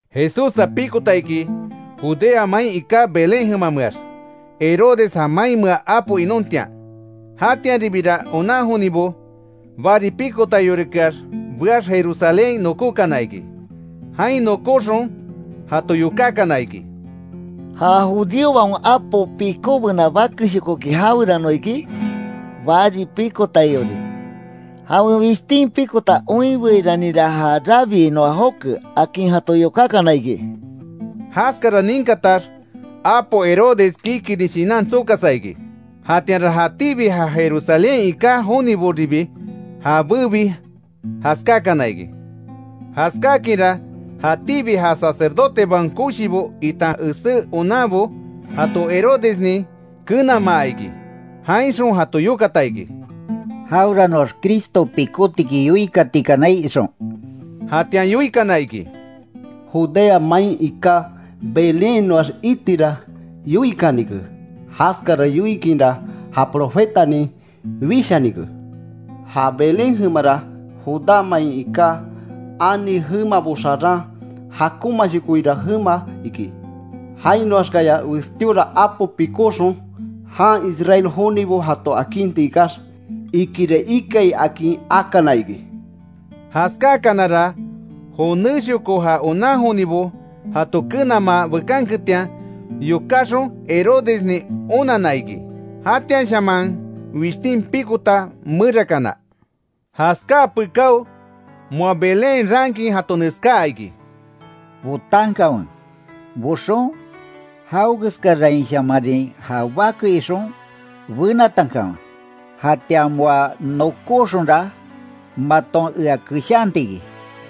Jesússa pikota iki, Judea main iká Belén jemameax, Herodes ja mainmea apo inontian. Jatianribira onan jonibo, bari pikotaiorikeax beax, Jerusalénhain nokókana iki. Jain nokóxon, jato yokákana iki: —¿Ja judíobaon apo pikóbena bakeshokoki jawerano iki? Bari pikotaiori, jawen wishtin pikota oinbeiranira ja rabii noa joke —akin jato yokákana iki. Jaskara ninkatax, apo Herodes kikini shinan tsokasa iki. Jatianra jatíbi ja Jerusalénhain iká joniboribi jabébi jaskákana iki. Jaskákinra, jatíbi ja sacerdotebaon koshibo, itan esé onanbo, jato Herodesnin kenamaa iki. Jainxon jato yokata iki: Jaweranoax Cristo pikótiki, yoikatikanai ixon. Jatian yoikana iki: —Judea main iká Belénhainoax itira yoikanike; jaskara yoikinra ja profetanin wishanike: ‘Ja Belén jemara, Judá main iká ani jemabo xaran, jakonmashokoira jemama iki. Jainoaxkaya westíora apo pikóxon, jan Israel jonibo jato akinti ikax’, ikira ikai, akin akana iki. Jaskáakanara, jonéshoko ja onan jonibo jato kenamaa bekanketian yokáxon, Herodesnin onanna iki jatianshaman wishtin pikota merakana. Jaskáa pekáo, moa Belénhain raankin jato neskáa iki: Botankanwe; boxon, jawekeskarainshamarin ja bake ixon, benatankanwe, jatian moa nokoxonra, maton ea keshanti iki,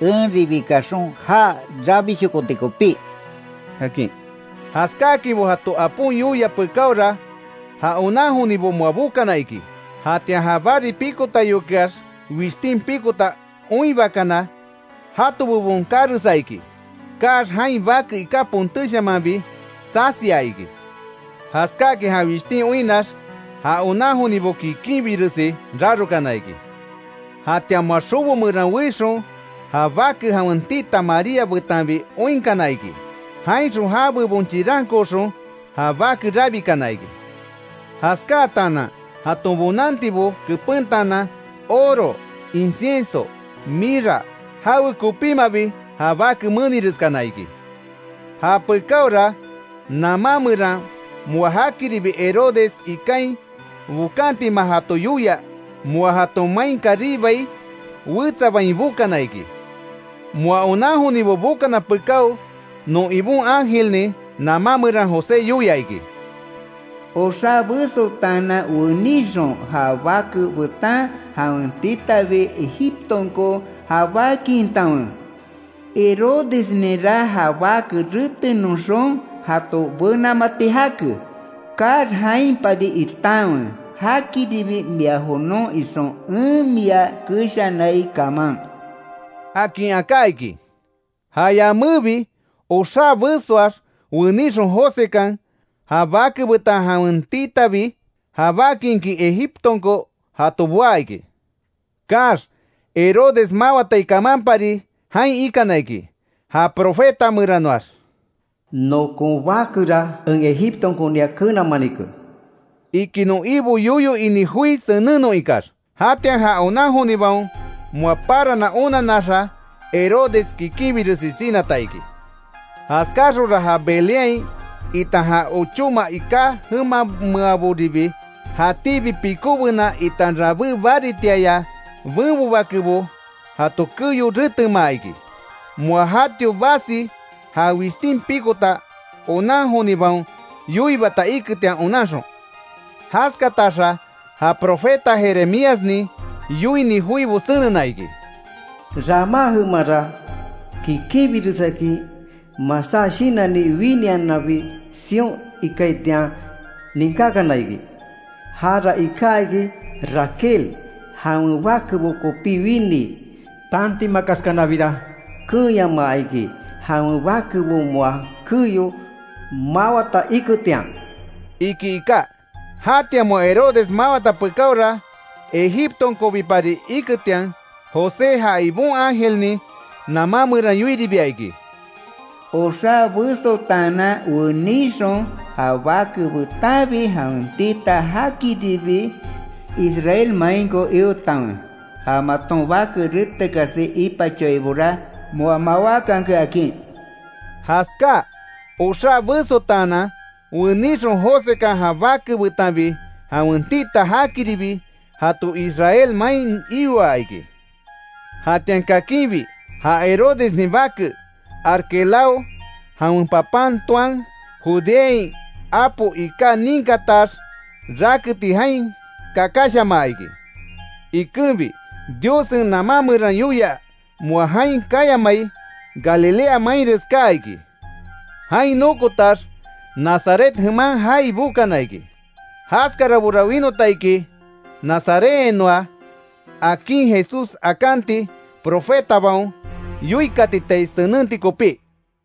enribi kaxon já rabishokoti kopí —akin. Jaskáakinbo jato apon yoia pekáora, ja onan jonibo moa bokana iki. Jatian ja bari pikotaiokeax wishtin pikota oinbakana, jato bebon kakaresa iki. Kaax, jain bake iká pontéshamanbi tsasia iki. Jaskáakin ja wishtin oinnax, ja onan jonibo kikinbiresi rarokana iki. Jatian, moa xobo meran weixon, ja bake jawen tita María betanbi oinkana iki. Jainxon ja bebon chirankooxon ja bake rabikana iki. Jaskáatanan jaton bonantibo kepentaanan, oro, incienso, mirra, jawekopímabi ja bake menireskana iki. Japekaora, namá meran moa jakiribi Herodes ikain bokantima jato yoia, moa jaton main karibai, wetsa bain bokana iki. Moa onan jonibo bokana pekáo, non Ibon ángelnin namá meran José yoia iki: “Oxá besotaanan wenixon, ja bake betan jawen titabi, Egiptonko jabákintanwe, Herodesninra ja bake retenoxon, jato benamati jake. Kaax, jainpari itanwe, jakiribi mia jonon ixon en mia keshanai kaman”, akin aká iki. Ja yamébi, oxá besoax wenixon, Josekan ja bake betan jawen titabi jabákinkin Egiptonko jato boá iki. Kaax, Herodes mawatai kamanpari jain ikana iki. Ja profeta meranoax, “nokon bakera en Egiptonkonia kenamanike”, iki non Ibo yoyo ini joi senennon ikax. Jatian ja onan jonibaon moa parana onanaxa, Herodes kikinbiresi sinata iki. Jaskáxonra ja Belénhain, itan ja ochóma iká jemameaboribi, jatíbi pikóbena itan rabé baritiaya benbo bakebo, jato keyo retemaa iki. Moa jatio basi ja wishtin pikota onan jonibaon yoiibata iketian onanxon. Jaskataxa, ja profeta Jeremíasnin yoini joibo senena iki: “Ramá jemanra, kikinbiresakin masá shinanni winiananbi sion ikaitian ninkákana iki. Jara iká iki Raquel, jawen bakebo kopí winii. Tantimakaskanabira, keenyamaa iki, jawen bakebo moa keyo mawata iketian”, iki iká. Jatian moa Herodes mawata pekáora, Egiptonkobipari iketian, José ja Ibon ángelnin namá meran yoiribia iki: “Oxá besotaanan weníxon, ja bake betanbi jawen tita, jakiribi Israel mainko iotanwe, ja maton bake retekasi ipachoaibora, moa mawákanke”, akin. Jaskáa oxá besotaanan wenixon, Josekan ja bake betanbi jawen tita jakiribi jato Israel main ioa iki. Jatian kakinbi ja Herodesnin bake Arquelao jawen papan toan, Judeain apo iká ninkatax, raketi jain kakashamaa iki. Ikenbi, Diossen namá meran yoia, moa jain kayamai, Galilea mainres kaa iki. Jain nokotax, Nazaret jeman jaai bokana iki. Jaskarabora winota iki, Nazarethainoa akin Jesús akanti, profetabaon yoikatitai senenti kopí.